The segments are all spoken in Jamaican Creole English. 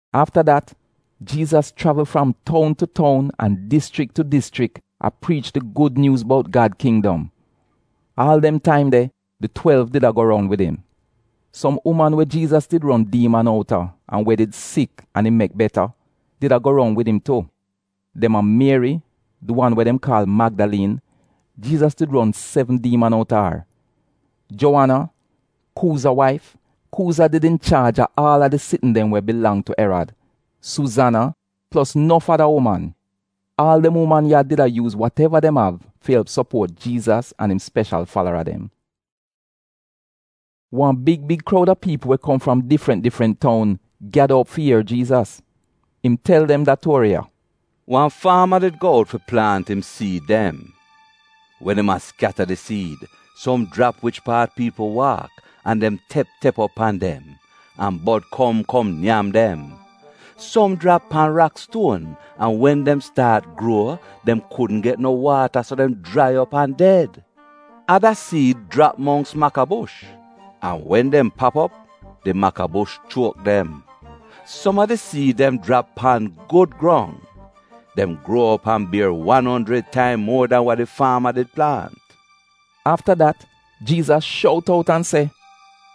Afta dat, Jiizas chravl fram toun tu toun an dischrik tu dischrik, a priich di gud nyuuz bout Gad kindom. Aal dem taim de, di twelv did a go roun wid im. Som uman we Jiizas did ron diiman outa an we did sik an im mek beta, did a go roun wid im tu, dem a: Mieri di wan we dem kaal Magdaliin (Jiizas did ron sevn diiman outa ar), Juowana, Kuuza waif, (Kuuza did inchaaj a aal a di sitn dem we bilang tu Erad), Suuzana, plos nof ada uman. Aal dem uman ya did a yuuz wateva dem av fi elp sopuot Jiizas an im speshal falara dem. Wan big big kroud a piipl we kom fram difrant difrant toun, gyada op fi ier Jiizas. Im tel dem da tuori ya: “Wan faama did go out fi plaant im siid dem. Wen im a skyata di siid, som jrap wich paat piipl waak an dem tep tep op pan dem, an bod kom kom nyam dem. Som jrap pan rakstuon, an wen dem staat gruo, dem kudn get no waata so dem jrai op an ded. Ada siid jrap mongks makabush, an wen dem pap op, di makabush chuok dem. Som a di siid dem jrap pan gud grong. Dem gruo op an bier wan onjrid taim muo dan wa di faama did plaant.” Afta dat Jiizas shout out an se,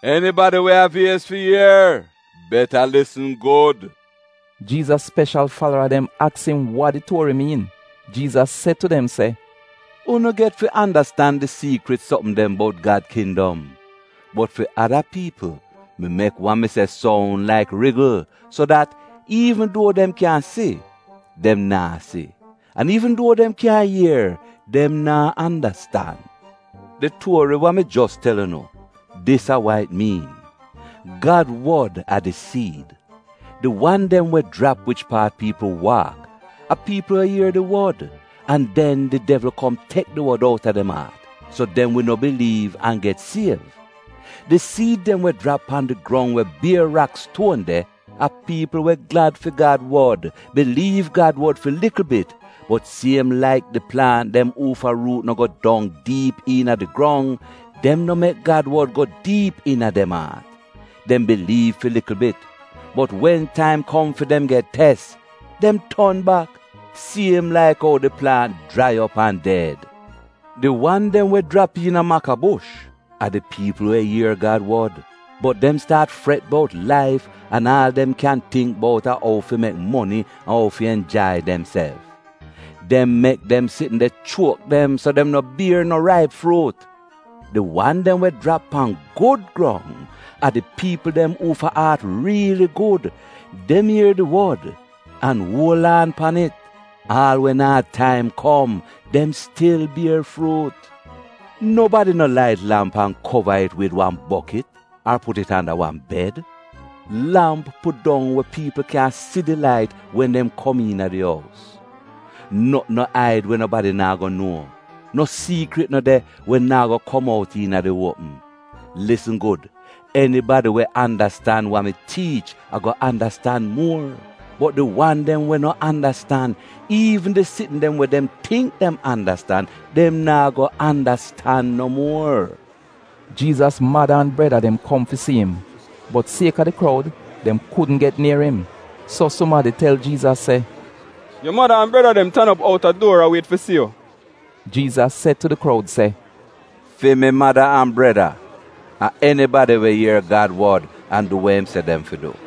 “Enibadi we av iez fi ier — beta lisn gud!” Jiizas speshal falara dem aks im wa di tuori miin. Jiizas se tu dem se, “Unu get fi andastan di siikrit sopm dem bout Gad kindom, bot fi ada piipl, mi mek wa mi se soun laik rigl. So dat, “ ‘Iivn duo dem kyan si, dem naa si; an iivn duo dem kyan ier, dem naa andastan.’ “Di tuori wa mi jos tel unu, dis a wa it miin: Gad wod a di siid. Di wan dem we jrap wich paat piipl waak, a piipl we ier di wod, an den di devl kom tek di wod outa dem aat, so dem wi no biliiv an get siev. Di siid dem we jrap pan di grong we bier rakstuon de a piipl we glad fi Gad wod biliiv Gad wod fi likl bit, bot siem laik di plaant dem uufa ruut no go dong diip iina di grong, dem no mek Gad wod go diip iina dem aat. Dem biliiv fi likl bit, bot wen taim kom fi dem get tes, dem ton bak — siem laik ou di plaant jrai op an ded. Di wan dem we jrap iina makabush, a di piipl we ier Gad wod, bot dem staat fret bout laif an aal dem kyan tingk bout a ou fi mek moni an ou fi enjai demself. Dem mek dem sitn de chuok dem so dem no bier no raip fruut. Di wan dem we jrap pan gud grong, a di piipl dem uufa aat riili gud. Dem ier di wod an uol aan pan it. Aal wen aad taim kom, dem stil bier fruut. “Nobadi no lait lamp an kova it wid wan bokit ar put it anda wan bed. Lamp pudong we piipl kyan si di lait wen dem kom iina di ous. Notn no aid, we nobadi naa go nuo. No siikrit no de we naa go kom out iina di uopm. Lisn gud! enibadi we andastan wa mi tiich ago andastan muor; bot di wan dem we no andastan, iivn di sitn dem we dem tingk dem andastan, dem naa go andastan no muor.” Jiizas mada an breda dem kom fi si im, bot sieka di kroud dem kudn get nier im. So sumadi tel Jiizas se, “Yu mada an breda dem tan op outa duor a wiet fi si yu.” Jiizas se tu di kroud se, “Fi mi mada an breda, a enibadi we ier Gad wod an du we im se dem fi du.”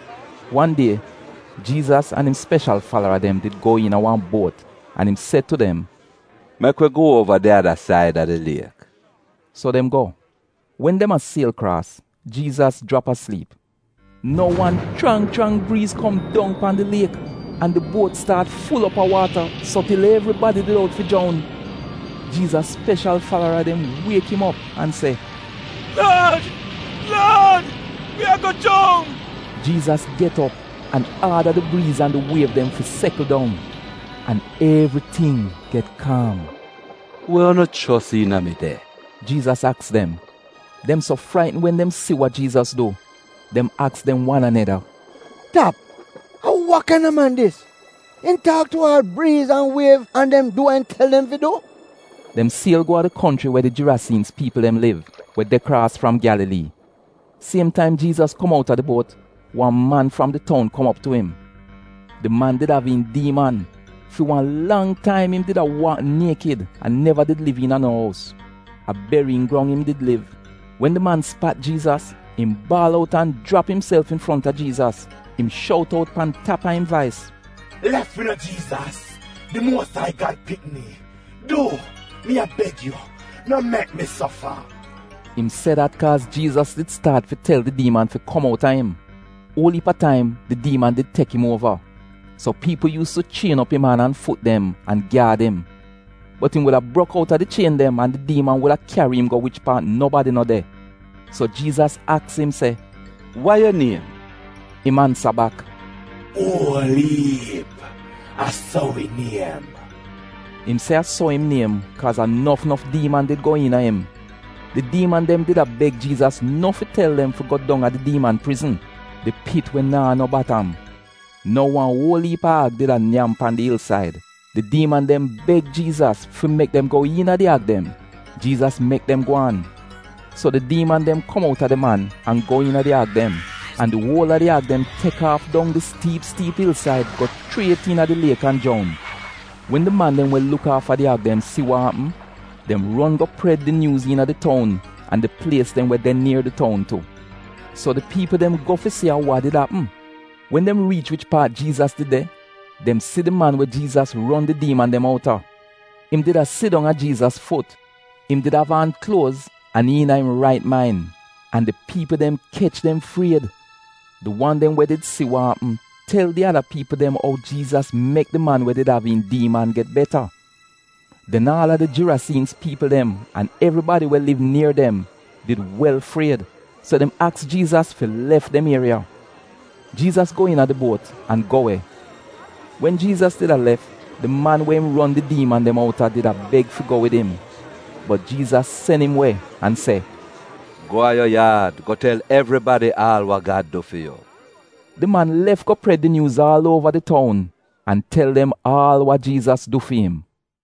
Wan die, Jiizas an im speshal falara dem did go iina wan buot an im se tu dem, “Mek wi go uova di ada said a di liek.” So dem go. Wen dem a siel kraas, Jiizas jrap a sliip. Nou wan chrang chrang briiz kom dong pan di liek, an di buot staat ful op a waata so til evribadi did out fi joun. Jiizas speshal falara dem wiek im op an se, “Laad! Laad! wi ago joun!” Jiizas get op an aada di briiz an di wiev dem fi sekl dong; an evriting get kaam. “We unu fiet de?” Jiizas aks dem. Dem so fraitn wen dem si wa Jiizas du, dem aks dem wan aneda, “Tap, a wa kaina man dis? Im taak tu aal briiz an wiev an dem du wa im tel dem fi du?” Dem siel go a di konchri we di Girasiinz piipl dem liv, we de kraas fram Gyalalii. Siem taim Jiizas kom outa di buot, wan man fram di toun kom op tu im. Di man did av iin diiman. Fi wan lang taim, im did a waak niekid an neva did liv iina no ous; a beriyin grong im did liv. Wen di man spat Jiizas, im baal out an jrap imself infronta Jiizas. Im shout out pan tap a im vais se, “Lef wi no Jiizas, di Muos Ai Gad Pikni? Du mi a beg yu, no mek mi sofa!” Im se dat kaaz Jiizas did staat fi tel di diiman fi kom outa im. (Uol iip a taim di diiman did tek im uova. So piipl yuus tu chien op im an an fut dem, an gyaad im. Bot im wuda brok out a di chien dem an di diiman wuda kyari im go wich paat nobadi no de.) So Jiizas aks im se, “Wa yu niem?” Im ansa bak, “ ‘Uol-iip’ — a so wi niem.” Im se a so im niem kaaz a nof nof diiman did go iina im. Di diiman dem did a beg Jiizas no fi tel dem fi go dong a di diiman prizn — di pit we naa no batam. Nou wan uol iip a ag did a nyam pan di ilsaid. Di diiman dem beg Jiizas fi mek dem go iina di ag dem. Jiizas mek dem gwaan. So di diiman dem kom outa di man, an go iina di ag dem, an di uol a di ag dem tek aaf dong di stiip stiip ilsaid go chriet iina di liek an joun. Wen di man dem we luk aafa di ag dem si wa apm, dem ron go pred di nyuuz iina di toun an di plies dem we de nier di toun tu. So di piipl dem go fi si a wa did apm. Wen dem riich wich paat Jiizas did de, dem si di man we Jiizas ron di diiman dem outa. Im did a sidong a Jiizas fut, im did av aan kluoz an iina im rait main. An di piipl dem kech dem fried. Di wan dem we did si wa apm, tel di ada piipl dem ou Jiizas mek di man we did av iin diiman get beta. Den aal a di Girasiinz piipl dem an evribadi we liv nier dem did wel fried so dem aks Jiizas fi lef dem ieriya. Jiizas go iina di buot an go we. Wen Jiizas did a lef, di man we im ron di diiman dem outa did a beg fi go wid im, bot Jiizas sen im we, an se, “Go a yu yaad go tel evribadi aal wa Gad du fi yu.” So, di man lef go pred di nyuuz aal uova di toun an tel dem aal wa Jiizas du fi im.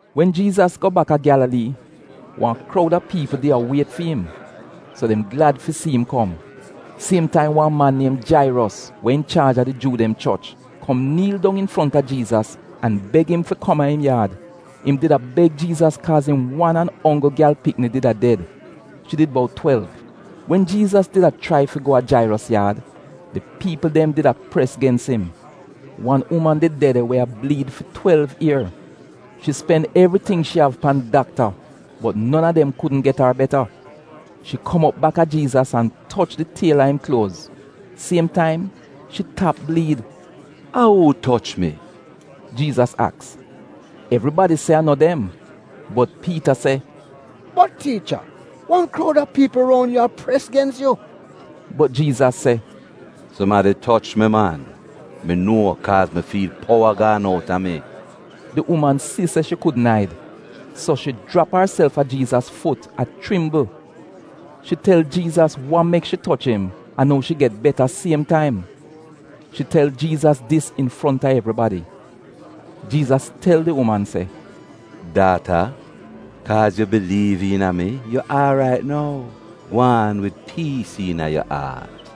Wen Jiizas go baka Gyalalii, wan kroud a piipl di a wiet fi im, so dem did glad fi si im kom. Siem taim wan man niem Jairos, we inchaaj a di Juu dem choch, kom niil dong infronta Jiizas, an beg im fi kom a im yaad. Im did a beg Jiizas kaaz im wan an onggl gyal pikni did a ded. Shi did bout twelv. Wen Jiizas did a chrai fi go a Jairos yaad, di piipl dem did a pres gens im. Wan uman did de de, we a bliid fi twelv ier. Shi spen evriting shi av pan dakta bot non a dem kudn get ar beta. Shi kom op baka Jiizas an toch di tiel a im kluoz. Siem taim shi tap bliid! “A uu toch mi?” Jiizas aks. Evribadi se a no dem bot Piita se, “Bot Tiicha, wan kroud a piipl ron yu a pres gens yu.” Bot Jiizas se, “Sumadi toch mi man. Mi nuo, kaaz mi fiil powa gaan outa mi.” Di uman si se shi kudn aid, so shi jrap arself a Jiizas fut a chrimbl. Shi tel Jiizas wa mek shi toch im an ou shi get beta siem taim. Shi tel Jiizas dis infronta evribadi. Jiizas tel di uman se, “Daata, kaaz yu biliiv iina mi, yu aarait nou. Gwaan wid piis iina yu aat.”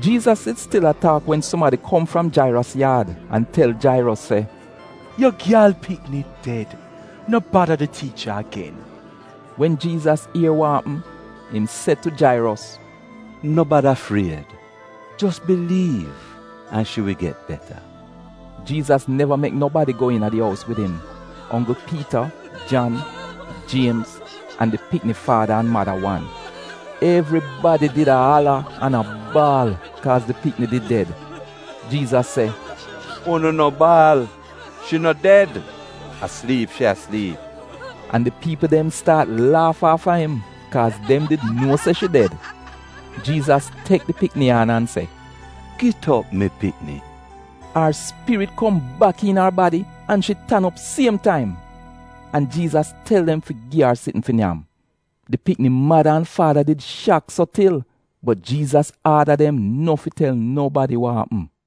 Jiizas did stil a taak wen sumadi kom fram Jairos yaad an tel Jairos se, “Yu gyal pikni ded, no bada di tiicha agen.” Wen Jiizas ier wa apm, im se tu Jairos, “No bada fried, jos biliiv, an shi wi get beta.” Jiizas neva mek nobadi go iina di ous wid im, onggl Piita, Jan, Jiemz, an di pikni faada an mada wan. Evribadi did a ala an a baal kaaz di pikni did ded. Jiizas se, “Unu no baal! Shi no ded; a sliip shi a sliip.” An di piipl dem staat laaf aafa im, kaaz dem did nuo se shi ded. Jiizas tek di pikni an an se, “Git op, mi pikni!” Ar spirit kom bak iina ar badi, an shi tan op siem taim. An Jiizas tel dem fi gi ar sitn fi nyam. Di pikni mada an faada did shak so til, bot Jiizas aada dem no fi tel nobadi wa apm.